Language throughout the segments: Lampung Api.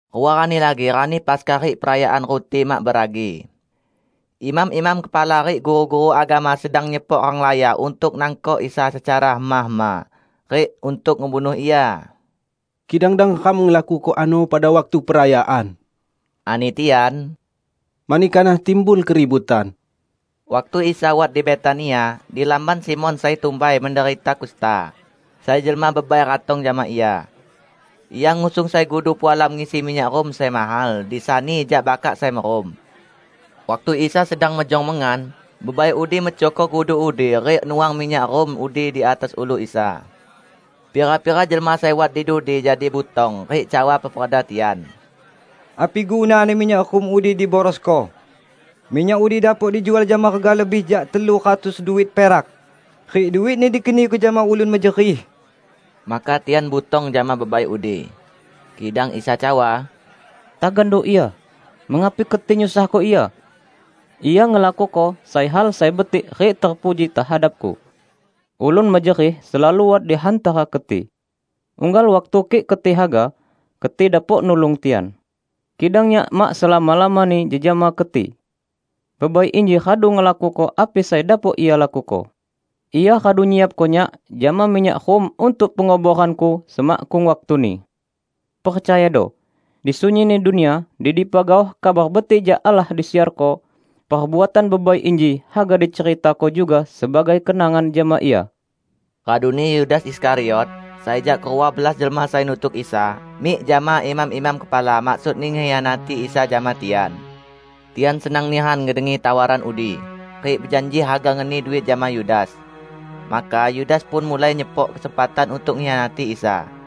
Rua rani lagi Rani Paskah rik Perayaan Ruti Mak Beragi. Imam-imam kepala rik guru-guru agama sedang nyepok renglaya untuk nangkok Isa secara hema-hema, rik untuk ngebunuh Ia. "Kidang dang ram lakuko ano pada waktu perayaan," ani tian, "mani kanah timbul keributan." Waktu Isa wat di Betania, di lamban Simon sai tumbai menderita kusta, sai jelma bebai ratong jama Ia. Ia ngusung sai gudu pualam ngisi minyak rum sai mahal, disani jak bakak sai merum. Waktu Isa sedang mejong mengan, bebai udi mecohko gudu udi rik nuang minyak rum udi di atas ulu Isa. Pira-pira jelma sai wat di dudi jadi butong rik cawa peperda tian, "Api gunani minyak rum udi diborosko? Minyak udi dapok dijual jama rega lebih jak telu ratus duit perak, rik duitni dikeniko jama ulun mejerih!" Maka tian butong jama bebai udi. Kidang Isa cawa, "Tagando ia! Mengapi keti nyusahko ia? Ia ngelakuko sai hal sai betik rik terpuji tehadap-Ku. Ulun mejerih selalu wat di hantara keti. Unggal waktu kik keti haga, keti dapok nulung tian. Kidang Nyak mak selama-lamani jejama keti. Bebai inji radu ngelakuko api sai dapok ia lakuko. Ia radu nyiapko Nyak jama minyak rum untuk penguboran-Ku semakkung waktuni. Percayado! Di sunyinni dunia, di dipa gaoh Kabar Betik jak Allah disiarko, perbuatan bebai inji haga diceritako juga sebagai kenangan jama ia." Raduni Yudas Iskariot, sai jak kerua belas jelma sai nutuk Isa, mik jama imam-imam kepala maksudni ngekhianati Isa jama tian. Tian senang nihan ngedengi tawaran udi, rik bejanji haga ngeni duit jama Yudas. Maka Yudas pun mulai nyepok kesempatan untuk ngekhianati Isa.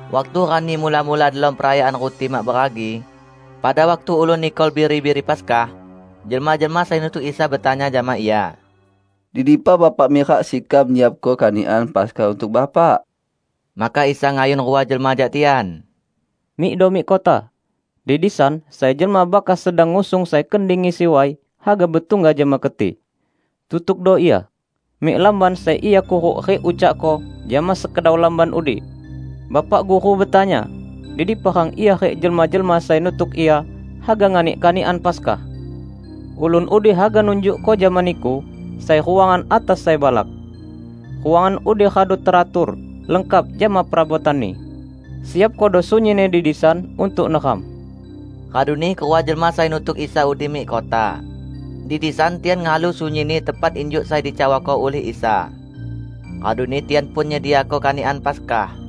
Waktu rani mula-mula delom Perayaan Ruti Mak Beragi -- pada waktu ulun nikol biri-biri Paskah -- jelma-jelma sai nutuk Isa betanya jama Ia, "Di dipa Bapak mirak sekam nyiapko kanikan Paskah untuk Bapak?" Maka Isa ngayun rua jelma jak tian, "Mikdo mik kota, di disan sai jelma bakas sedang ngusung sai kendi ngisi way, haga betungga jama keti. Tutukdo ia mik lamban sai ia kuruk rik ucakko jama sekedau lamban udi, 'Bapak Guru betanya, di dipa rang Ia rik jelma-jelma sai nutuk Ia haga nganik kanikan Paskah.' Ulun udi haga nunjukko jama niku sai ruangan atas sai balak. Ruangan udi radu teratur, lengkap jama perabotanni. Siapkodo sunyinni di disan untuk neram." Raduni kerua jelma sai nutuk Isa udi mik kota. Di disan tian ngehalu sunyinni tepat injuk sai dicawako ulih Isa. Raduni tian pun nyediako kanikan Paskah.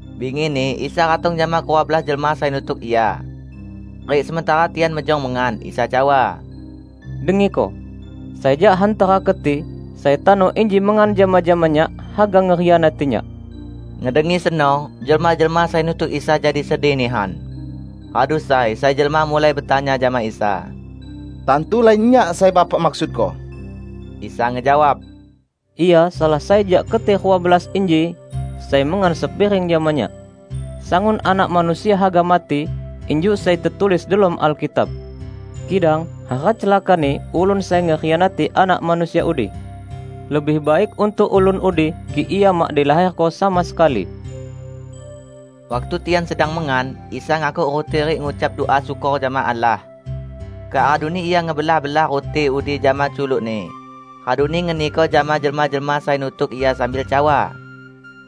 Bingini, Isa ratong jama kerua belas jelma sai nutuk Ia. Rik sementara tian mejong mengan, Isa cawa, "Dengiko: sai jak hantara keti, sai tano inji mengan jama-jama Nyak haga ngekhianati Nyak." Ngedengi seno, jelma-jelma sai nutuk Isa jadi sedih nihan. Radu sai, sai jelma mulai betanya jama Isa, "Tantu lain nyak sai Bapak maksudko?" Isa ngejawab, "Ia salah sai jak keti rua belas inji, sai mengan sepiring jama Nyak. Sangun Anak Manusia haga mati injuk sai tetulis delom Alkitab. Kidang hara celakani ulun sai ngekhianati Anak Manusia udi! Lebih baik untuk ulun udi kik ia mak dilaherko sama sekali!" Waktu tian sedang mengan, Isa ngakuk ruti rik ngucap dua syukor jama Allah. Kak raduni Ia ngebelah-belah ruti udi jama culuk-Ni, raduni ngeniko jama jelma-jelma sai nutuk Ia sambil cawa,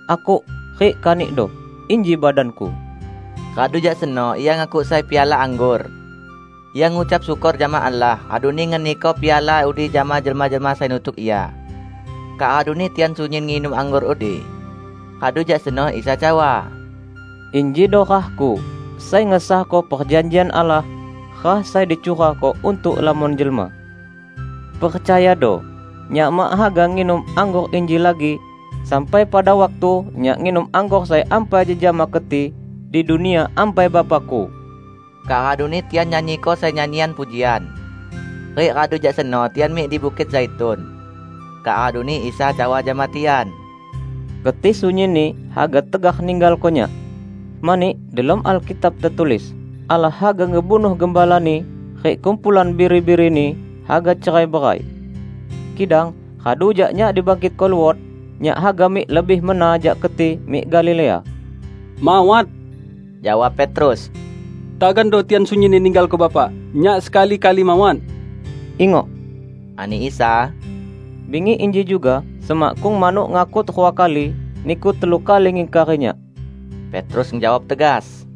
"Akuk rik kanikdo, inji badan-Ku." Radu jak seno Ia ngakuk sai piala anggor. Ia ngucap syukor jama Allah, raduni ngeniko piala udi jama jelma-jelma sai nutuk Ia. Kak raduni tian sunyin nginum anggor udi. Radu jak seno Isa cawa, "Injido rah-Ku sai ngesahko perjanjian Allah, rah sai dicurahko untuk lamon jelma. Percayado: Nyak mak haga nginum anggor inji lagi, sampai pada waktu Nyak nginum anggor sai ampai jejama keti di Dunia Ampai Bapa-Ku." Kak raduni tian nyanyiko sai nyanyian pujian. Rik radu jak seno tian mik di Bukit Zaitun. Kak raduni Isa cawa jama tian, "Keti sunyinni haga tegar ninggalko Nyak. Mani delom Alkitab tetulis, 'Allah haga ngebunuh gembalani, rik kumpulan biri-birini haga cerai-berai.' Kidang radu jak Nyak dibangkitko luot, Nyak haga mik lebih mena jak keti mik Galilea." "Mawat," jawab Petrus, "tagando tian sunyinni ninggalko Bapak, nyak sekali-kali mawat." "Ingok," ani Isa, "bingi inji juga, semakkung manuk ngakut rua kali, niku telu kali ngingkari Nyak." Petrus ngejawab tegas,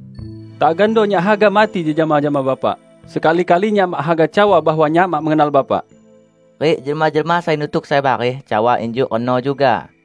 "Tagando nyak haga mati jejama jama Bapak, sekali-kali nyak mak haga cawa bahwa nyak mak mengenal Bapak!" Rik jelma-jelma sai nutuk sai bareh cawa injuk reno juga.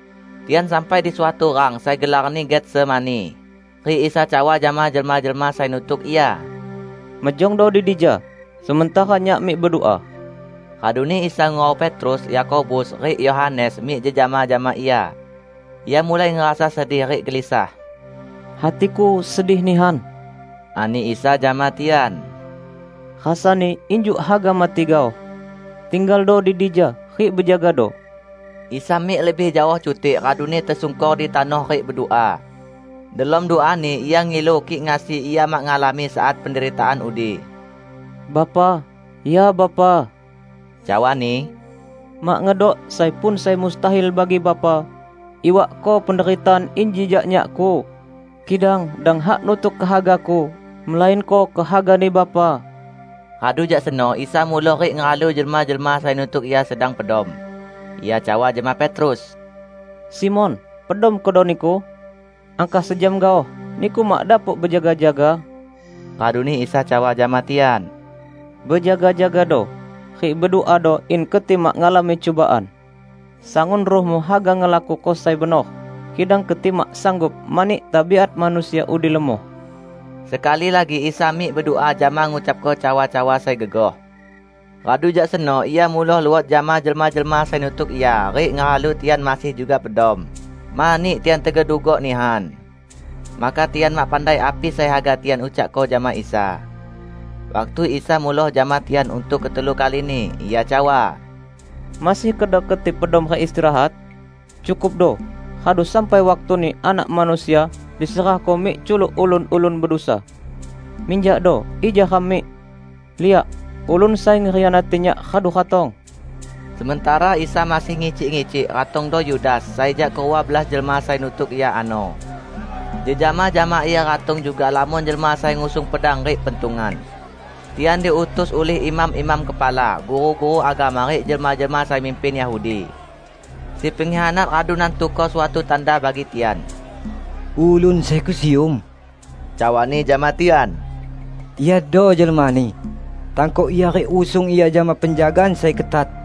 Tian sampai di suatu rang sai gelarni Getsemani, rik Isa cawa jama jelma-jelma sai nutuk Ia, "Mejongdo di dija sementara Nyak mik bedua." Raduni Isa ngurau Petrus, Yakobus, rik Yohanes mik jejama jama Ia. Ia mulai ngerasa sedih rik gelisah. "Hati-Ku sedih nihan," ani Isa jama tian, "rasani injuk haga mati gaoh. Tinggaldo di dija rik bejagado!" Isa mik lebih jaoh cutik raduni tesungkor di tanoh rik bedua. Delom dua-Ni Ia ngilu kik ngasi Ia mak ngalami saat penderitaan udi. "Bapa, ya Bapa," cawa-Ni, "mak ngedok sai pun sai mustahil bagi Bapa. Iwakko penderitaan inji jak Nyak-Ku. Kidang dang hak nutuk kehaga-Ku melainko kehaga-Ni Bapa." Radu jak seno Isa muloh rik ngehalu jelma-jelma sai nutuk Ia sedang pedom. Ia cawa jama Petrus, "Simon, pedom kedo niku? Angkah sejam gaoh, niku mak dapok bejaga-jaga?" Raduni Isa cawa jama tian, "Bejaga-jagado, rik beduado in keti mak ngalami cubaan. Sangun ruhmu haga ngelakuko sai benor, kidang keti mak sanggup mani tabiat manusia udi lemoh." Sekali lagi Isa mik bedua jama ngucapko cawa-cawa sai gegoh. Radu jak seno Ia muloh luot jama jelma-jelma sai nutuk Ia rik ngehalu tian masih juga pedom, mani tian tegedugok nihan. Maka tian mak pandai api sai haga tian ucakko jama Isa. Waktu Isa muloh jama tian untuk ketelu kalini, Ia cawa, "Masih kedo keti pedom rik istirahat? Cukupdo! Radu sampai waktuni Anak Manusia diserahko mik culuk ulun-ulun bedusa. Minjakdo, ija ram mik. Liak! Ulun sai ngekhianati Nyak radu ratong!" Sementara Isa masih ngicik-ngicik, ratongdo Yudas, sai jak kerua belas jelma sai nutuk Ia ano. Jejama jama ia ratong juga lamon jelma sai ngusung pedang rik pentungan. Tian diutus ulih imam-imam kepala, guru-guru agama rik jelma-jelma sai mimpin Yahudi. Si pengkhianat radu nantuko suatu tanda bagi tian. "Ulun sai kusium," cawani jama tian, "Iado jelmani. Tangkok Ia rik usung Ia jama penjagaan sai ketat."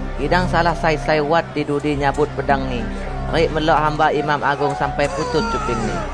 Kidang salah sai sai wat di dudi nyabut pedangni rik melok hamba imam agung sampai putus cupingni.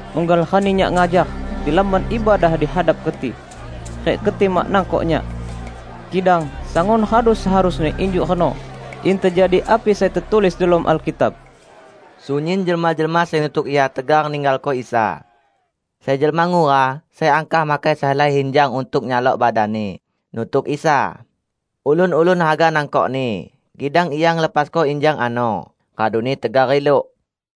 Unggal rani Nyak ngajar di Lamban Ibadah di hadap keti, rik keti mak nangkok Nyak. Kidang sangun radu seharusni injuk reno, in tejadi api sai tetulis delom Alkitab." Sunyin jelma-jelma sai nutuk Ia tegar ninggalko Isa. Sai jelma ngura, sai angkah makai sehelai injang untuk nyalok badanni, nutuk Isa. Ulun-ulun haga nangkokni, kidang ia ngelepasko injangni ano, raduni tegar riluk.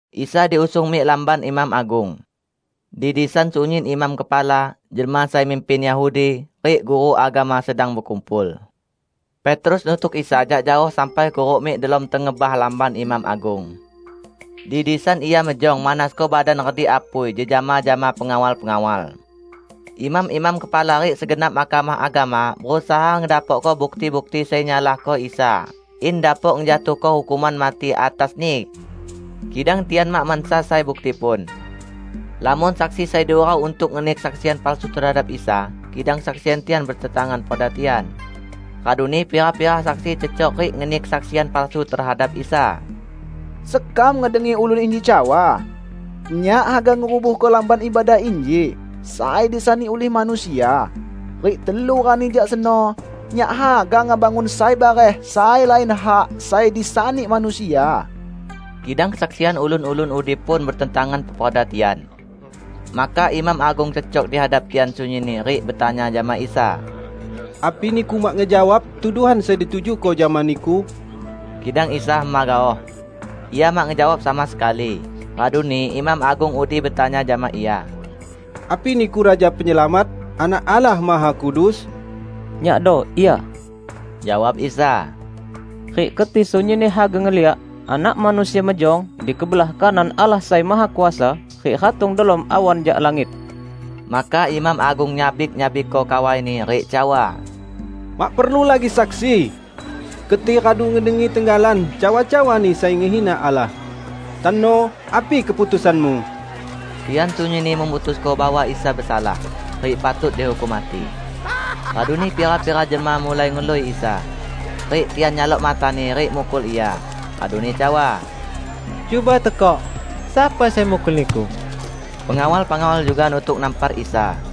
Isa diusung mik lamban imam agung. Di disan sunyin imam kepala, jelma sai mimpin Yahudi, rik guru agama sedang bekumpul. Petrus nutuk Isa jak jaoh sampai kuruk mik delom tengebah lamban imam agung. Di disan ia mejong manasko badan redik apui jejama jama pengawal-pengawal. Imam-imam kepala rik segenap Mahkamah Agama berusaha ngedapokko bukti-bukti sai nyalahko Isa in dapok ngejatuhko hukuman mati atas-Ni. Kidang tian mak mansa sai bukti pun. Lamon saksi sai diurau untuk ngeni kesaksian palsu tehadap Isa, kidang kesaksian tian betentangan peperda tian. Raduni pira-pira saksi cecok rik ngeni kesaksian palsu tehadap Isa, "Sekam ngedengi ulun inji cawa, 'Nyak haga ngerubuhko Lamban Ibadah inji sai disani ulih manusia, rik telu rani jak seno, Nyak haga ngebangun sai bareh sai lain hak sai disani manusia.' " Kidang kesaksian ulun-ulun udi pun betentangan peperda tian. Maka imam agung cecok di hadap tian sunyinni rik betanya jama Isa, "Api Niku mak ngejawab tuduhan sai ditujuko jama Niku?" Kidang Isa hema gaoh. Ia mak ngejawab sama sekali. Raduni imam agung udi betanya jama Ia, "Api Niku Raja Penyelamat, Anak Allah Mahakudus?" "Nyakdo Ia," jawab Isa, "rik keti sunyinni haga ngeliak Anak Manusia mejong di kebelah kanan Allah Sai Mahakuasa rik ratong delom awan jak langit!" Maka imam agung nyabik-nyabikko kawaini rik cawa, "Mak perlu lagi saksi! Keti radu ngedengi tenggalan cawa-cawa-Ni sai ngehina Allah. Tano api keputusanmu?" Tian sunyinni memutusko bahwa Isa besalah, rik patut dihukum mati. Raduni pira-pira jelma mulai ngelui Isa, rik tian nyalok mata-Ni rik mukul Ia, raduni cawa, "Cuba tekok, sapa sai mukul Niku?" Pengawal-pengawal juga nutuk nampar Isa.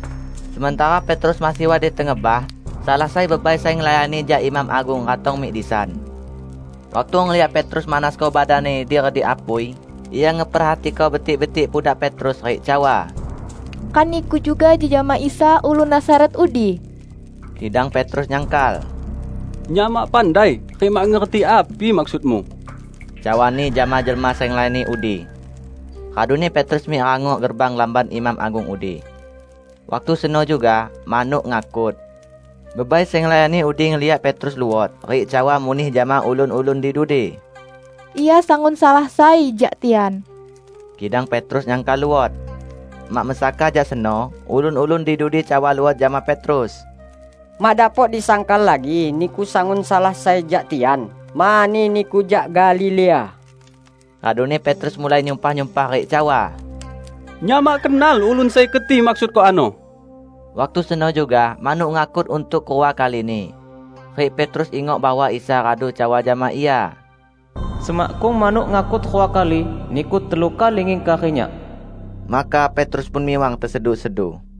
Sementara Petrus masih wat di tengebah, salah sai bebai sai ngelayani jak imam agung ratong mik disan. Waktu ngeliak Petrus manasko badanni di redik apui, ia ngeperhatiko betik-betik pudak Petrus rik cawa, "Kan niku juga jejama Isa ulun Nazaret udi?" Kidang Petrus nyangkal, "Nyak mak pandai rik mak ngerti api maksudmu," cawani jama jelma sai ngelayani udi. Raduni Petrus mik rangok gerbang lamban imam agung udi. [Waktu seno juga, manuk ngakut.] Bebai sai ngelayani udi ngeliak Petrus luot, rik cawa muneh jama ulun-ulun di dudi, "Ia sangun salah sai jak tian!" Kidang Petrus nyangkal luot. Mak mesaka jak seno, ulun-ulun di dudi cawa luot jama Petrus, "Mak dapok disangkal lagi niku sangun salah sai jak tian, mani niku jak Galilea!" Raduni Petrus mulai nyumpah-nyumpah rik cawa, "Nyak mak kenal ulun sai keti maksudko ano!" Waktu seno juga manuk ngakut untuk kerua kalini. Rik Petrus ingok bahwa Isa radu cawa jama ia, "Semakkung manuk ngakut rua kali, niku telu kali ngingkari Nyak." Maka Petrus pun miwang tesedu-sedu.